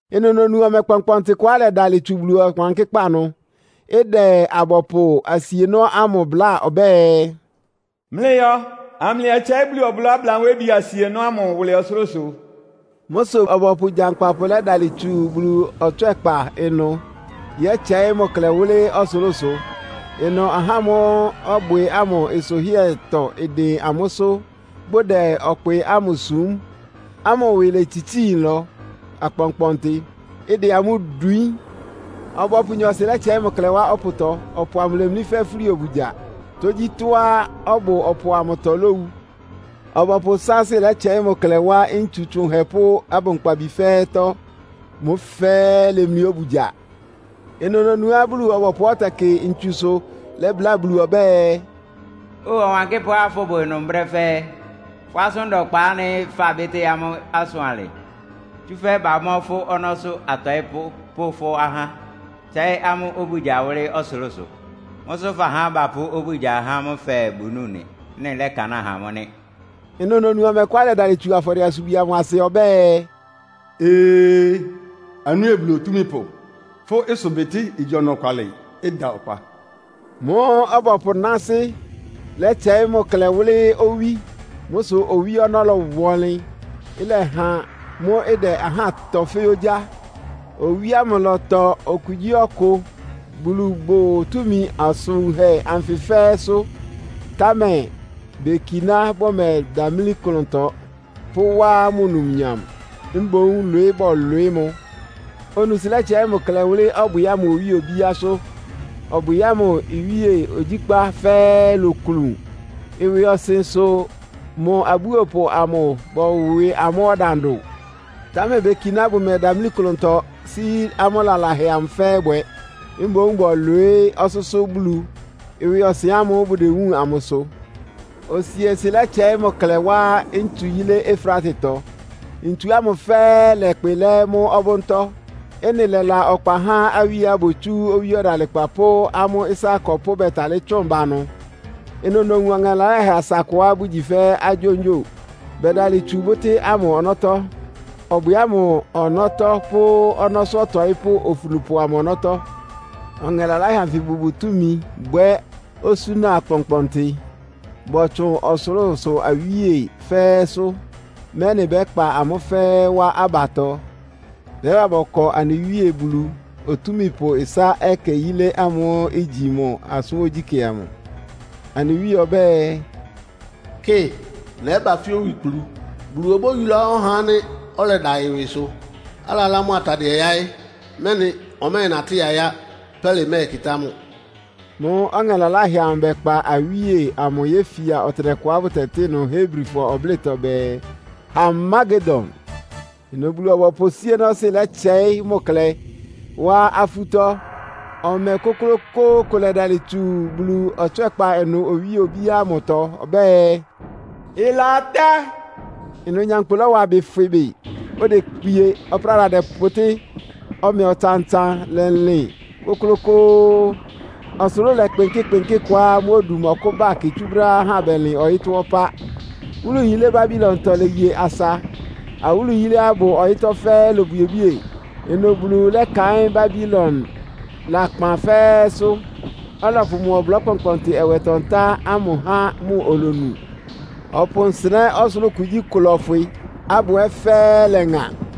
Ɩnʋ nonu ɔmɛ kpɔnkpɔntɩ kʋá ɩlɛdalɩ tsu Bulu Ɔwankɩ́kpá ɩnʋ. Ɩdɛ abɔpʋ asienɔ́ ámʋ bláa ɔbɛ́ɛ, “Mlɩyɔ, amlɩyɛtsɛɩ́ Bulu ɔblɔ́ ablanwébi asienɔ́ ámʋ wʋlɩ́ ɔsʋlʋ́sʋ.” Mʋ́ sʋ ɔbɔpʋ gyankpapʋ lɛ́dalɩ tsu Bulu ɔtswɛ́kpa ɩnʋ yɛtsɛɩ́ mʋ klɛ wʋ́lɩ́ ɔsʋlʋ́sʋ. Ɩnʋ ahá ámʋ́ʋ́ ɔbwɩ ámʋ nsʋhɩ́ɛtɔ ɩdɩn amʋ́sʋ́, bʋdɛ ɔkpɩ ámʋ sum ámʋ ɩwɩ létsitsíi nlɔ akpɔnkpɔntɩ, ɩdɛ amʋ́ dwiín. Ɔbɔpʋ nyɔɔsɩ lɛ́tsɛɩ́ mʋ klɛ wá ɔpʋtɔ. Ɔpʋ amʋ lémlí fɛ́ fúli obugya. Tógyítɔ́á ɔbʋ ɔpʋ amʋtɔ lówu. Ɔbɔpʋ sáásɩ́ lɛ́tsɛɩ́ mʋ klɛ wá ntsu tsʋnhɛ pʋ́ abʋnkpabi fɛ́ɛ́tɔ́. Mʋ́ fɛ́ɛ́ ilemlí obugya. Ɩnʋ nonuá Bulu-ɔbɔpʋá ɔtɛkɩ ntsusʋ lɛ́bláa Bulu ɔbɛ́ɛ, “Óo Ɔwankɩ́pʋ́á fʋ́bʋ ɩnʋ brɛ́ fɛ́ɛ́. Fʋ́ asʋ́n da ɔkpa ánɩ́ fabɩ́tɩ́ amʋ́ ɩsʋ alɩ. Tsúfɛ́ bamɔ́ fʋ́ ɔnɔ́sʋ́ atɔɩ́pʋ́ pʋ́ fʋ́ ahá, tsɛ́ɩ́ amʋ́ obugya wʋ́lɩ́ ɔsʋlʋ́sʋ. Mʋ́ sʋ́ fahá bapʋ́ obugya há amʋ́ fɛɛ, bʋnúu nɩ. Ɩ́nɩ lɛ́kanáa ha amʋ́ nɩ́.” Ɩnʋ nonu ɔmɛ kʋá ɩlɛdalɩ tsu afɔdɩɛ-asubwi ámʋ asɩ ɔbɛ́ɛ, “Ee, anɩ Wíe Bulu Otúmípʋ, fʋ́ ɩsʋbɩtɩ́ igyi ɔnɔkwalɩ, ɩda ɔkpa.” Mʋ́ʋ́ ɔbɔpʋ náásɩ́ lɛ́tsɛɩ́ mʋ klɛ wʋ́lɩ́ owí. Mʋ́ sʋ owí ɔnɔ́ lɔwa ɔnlɩn, ɩlɛha mʋ́ ɩdɛ ahá tɔ fɛ́ ogyá. Owí ámʋ ɩlɔtɔ okugyíɔkʋ. Bulu bʋ́ʋ túmi asʋn wunhɛ anfɩ fɛ́ɛ́sʋ́, támɛ bekiná bʋmɛdamlí klʋntɔ; pʋ́wá mʋ numnyam, mboún lwɩɩ́ bɔlwɩɩ́ mʋ. Onuusɩ lɛ́tsɛɩ́ mʋ klɛ wʋ́lɩ́ ɔbwɩ ámʋ owíe obíásʋ́. Ɔbwɩ ámʋ iwíe ogyíkpá fɛ́ɛ́ iloklun. Ɩwɩɔsɩn sʋ mʋ abúopʋ amʋ bɔwɩ amʋ́ ɔdandʋ. Támɛ bekiná bʋmɛdamlí klʋntɔ sí amʋ́ lalahɛ amʋ fɛ́ɛ́ bwɛ. Mboún bɔlwɩɩ́ ɔsʋ́sʋ́ Bulu, ɩwɩɔsɩn ámʋ́ʋ́ bʋdewúun amʋ sʋ. Osiesɩ lɛ́tsɛɩ́ mʋ klɛ wá ntsu yílé Efratetɔ. Ntsu ámʋ fɛ́ɛ́ ɩlɛkpɩ lɛ́ mʋ́ ɔbʋ́ntɔ́. Ɩ́nɩ lɛ́la ɔkpa há awíeá botsú owí ɔdalɩkpa pʋ́ amʋ́ ɩsá akɔpʋ́ bɛ́talɩ́ tsʋn ba ɩnʋ. Ɩnʋ nowun ɔŋɛ laláhɛ asa akʋá bʋgyi fɛ́ agyóngyo, bɛdalɩ tsu bʋ́tɩ́ ámʋ ɔnɔ́tɔ́, ɔbwɩ ámʋ ɔnɔ́tɔ́ pʋ́ ɔnɔ́sʋ́ ɔtɔɩ́pʋ́ ofunupʋ amʋ ɔnɔ́tɔ́. Ɔŋɛ laláhɛ anfɩ bʋbʋ túmi bwɛ́ osúna akpɔnkpɔntɩ. Bɔtsʋn ɔsʋlʋ́sʋ awíe fɛ́ɛ́sʋ́, mɛ́nɩ bɛ́kpa amʋ́ fɛ́ɛ́ wá abatɔ, bɛ́ba bɔkɔ anɩ Wíe Bulu Otúmípʋ ɩsá ɛkɛ yilé ámʋ́ʋ́ igyi mʋ asʋ́n ogyíkɛ́ amʋ. Anɩ Wíe ɔbɛ́ɛ, “Kɩ, nɛ́ba fɛ́ owikplu. Bulu obóyulá ɔhá ánɩ́ ɔlɛda ɩwɩsʋ, alalá mʋ atadɩɛ yáɩ́, mɛ́nɩ ɔmɛ́ɛnatɩ́ yayá, pɛ́lɩ mɛ́ɛkɩtá mʋ.” Mʋ́ʋ́ ɔŋɛ laláhɛ amʋ bɛkpa awíe amʋ yéfia ɔtɩnɛkʋá bʋtɛtɩ́ ɩnʋ Hebrifɔ ɔblɩ́tɔ bɛɛ, “Harmagedon.” Ɩnʋ Bulu-ɔbɔpʋ síénɔ́sɩ́ lɛ́tsɛɩ́ mʋ klɛ wá afútɔ́. Ɔmɛ kʋ́klʋ́kʋ́ʋ́ kʋ lɛdalɩ tsu Bulu ɔtswɛ́kpa ɩnʋ owíe obíá ámʋtɔ ɔbɛ́ɛ, “Ɩlatá!” Ɩnʋ nyankpʋ lɔ́wa ɩbɩ fwɩ bɩ. Odekpie, ɔpráda dɛpʋtɩ́. Ɔmɛ ɔtsan-ɔtsan lɛlɩn kʋ́klʋ́kʋ́ʋ́, ɔsʋlʋ́ʋ lɛkpɩnkɩ́ kpɩnkɩ́ kʋá mʋ́ odu ɩmɔkʋ́ba kɩ tsú brɛ́á ahá bɛlɩn ɔyɩ́tɔ́ ɔpá. Wúlu yilé Babilontɔ léye asa. Awúlu yiléá ɩbʋ ɔyɩ́tɔ́ fɛ́ɛ́ ilobwiebwíe. Ɩnʋ Bulu lɛ́kaɩ́n Babilon lakpan fɛ́ɛ́sʋ́, ɔlɔpʋ mʋ ɔblɔ́ kpɔnkpɔntɩ ɛwɛtɔ-ntá ámʋ há mʋ olonu. Ɔpʋ nsɩnɛ́ ɔsʋlʋ́ʋ kugyíkʋ lɔ́fwɩ, abʋ ɛ́ fɛ́ɛ́ ɩlɛŋa.